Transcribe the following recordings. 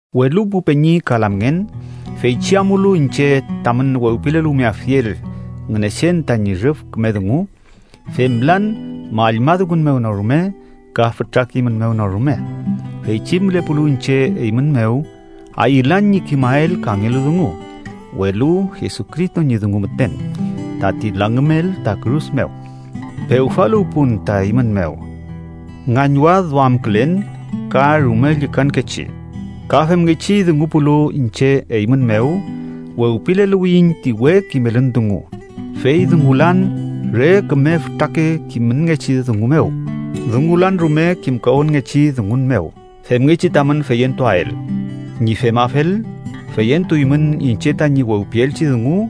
Welu pu peñi ka lamngen, feychi amulu iñche tamün wewpileluwmeafiel Ngünechen tañi rüf küme dungu, femlan mallma dungun mew no rume ka fütra kimün mew no rume. Feychi mülepulu iñche eymün mew, ayülan ñi kimael kangelu dungu, welu Jesucristo ñi dungu müten, tati langümel ta kürus mew. Pewfaluwpun ta eymün mew ngañwadduamkülen ka rume llükankechi ka femngechi dungupulu iñche eymün mew wewpileluwiyiñ ti we kimelün dungu, fey dungulan re küme fütrake kimünngechi dungu mew, dungulan rume kimkawünngechi dungun mew femngechi tamün feyentuael. Ñi femafel, feyentuymün iñche tañi wewpielchi dungu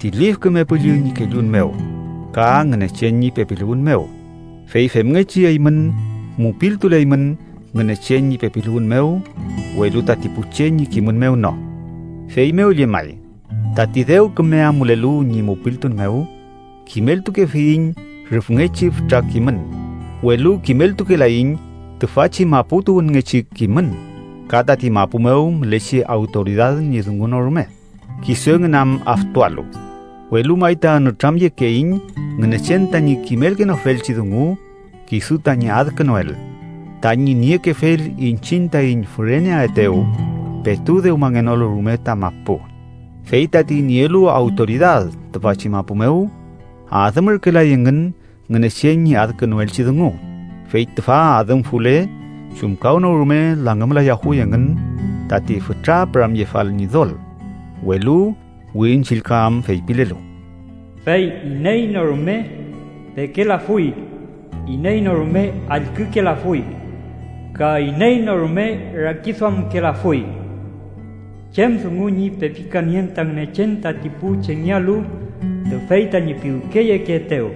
ti Lif Küme Püllü ñi kellun mew ka Ngünechen ñi pepiluwün mew. Fey femngechi eymün mupiltuleymün Ngünechen ñi pepiluwün mew, welu tati pu che ñi kimün mew no. Feymew llemay, tati dew küme amulelu ñi mupiltun mew kimeltukefiyiñ rüfngechi fütra kimün, welu kimeltukelaiñ tüfachi mapu tuwünngechi kimün ka tati mapu mew mülechi awtoridad ñi dungu no rume, kisu engün am aftualu. Welu may ta nütramyekeiñ Ngünechen tañi kimelkenofelchi dungu kisu tañi adkünuel, tañi niekefel iñchiñ taiñ füreneaetew petu dewmangenolu rume ta mapu. Fey tati nielu awtoridad tüfachi mapu mew adümürkelay engün Ngünechen ñi adkünuelchi dungu, fey tüfa adümfule chumkawnorume langümlayafuy engün tati fütra püramyefal Ñidol. Welu Wirin Chillka am feypilelu: “Fey iney no rume pekelafuy, iney no rume allkükelafuy, ka iney no rume rakiduamkelafuy chem dungu ñi pepikanien ta Ngünechen tati pu chengealu, tüfey tañi piwkeyekeetew.”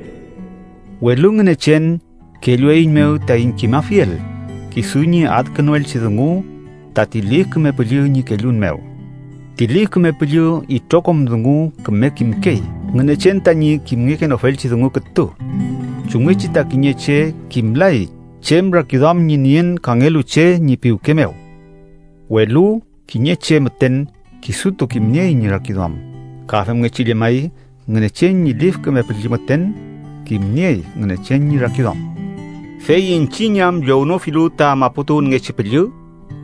Welu Ngünechen kellueiñmew taiñ kimafiel kisu ñi adkünuelchi dungu tati Lif Küme Püllü ñi kellun mew. Ti Lif Küme Püllü itrokom dungu küme kimkey, Ngünechen tañi kimngekenofelchi dungu kütu. Chumngechi ta kiñe che kimlay chem rakiduam ñi nien kangelu che ñi piwke mew, welu kiñe che müten kisutu kimniey ñi rakiduam. Ka femngechi llemay, Ngünechen ñi Lif Küme Püllü müten kimniey Ngünechen ñi rakiduam. Fey iñchiñ am llownofilu ta maputuwünngechi püllü,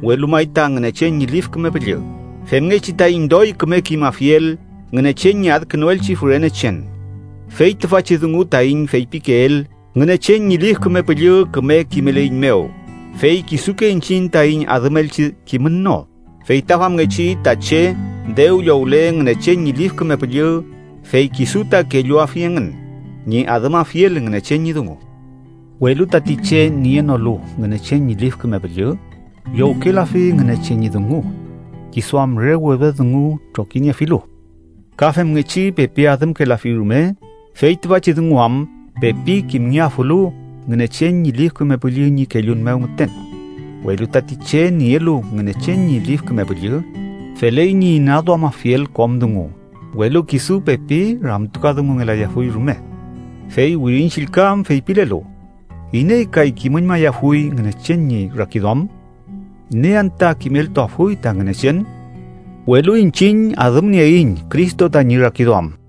welu may ta Ngünechen ñi Lif Küme Püllü, femngechi taiñ doy küme kimafiel Ngünechen ñi adkünuelchi fürenechen. Fey tüfachi dungu taiñ feypikeel, Ngünechen ñi Lif Küme Püllü küme kimeleiñmew, fey kisuke iñchiñ taiñ adümelchi kimün no. Fey ta famngechi ta che dew llowle Ngünechen ñi Lif Küme Püllü, fey kisu ta kelluafi engün ñi adümafiel Ngünechen ñi dungu. Welu tati che nienolu Ngünechen ñi Lif Küme Püllü, llowkelafi Ngünechen ñi dungu, kisu am re wedwed dungu trokiniefilu. Ka femngechi pepi adümkelafi rume, fey tüfachi dungu am pepi kimngeafulu Ngünechen ñi Lif Küme Püllü ñi kellun mew müten. Welu tati che nielu Ngünechen ñi Lif Küme Püllü, feley ñi inaduamafiel kom dungu, welu kisu pepi ramtukadungungelayafuy rume. Fey Wirin Chillka am feypilelu: “¿Iney kay kimüñmayafuy Ngünechen ñi rakiduam? ¿Iney anta kimeltuafuy ta Ngünechen?”, welu iñchiñ adümnieiñ Cristo tañi rakiduam.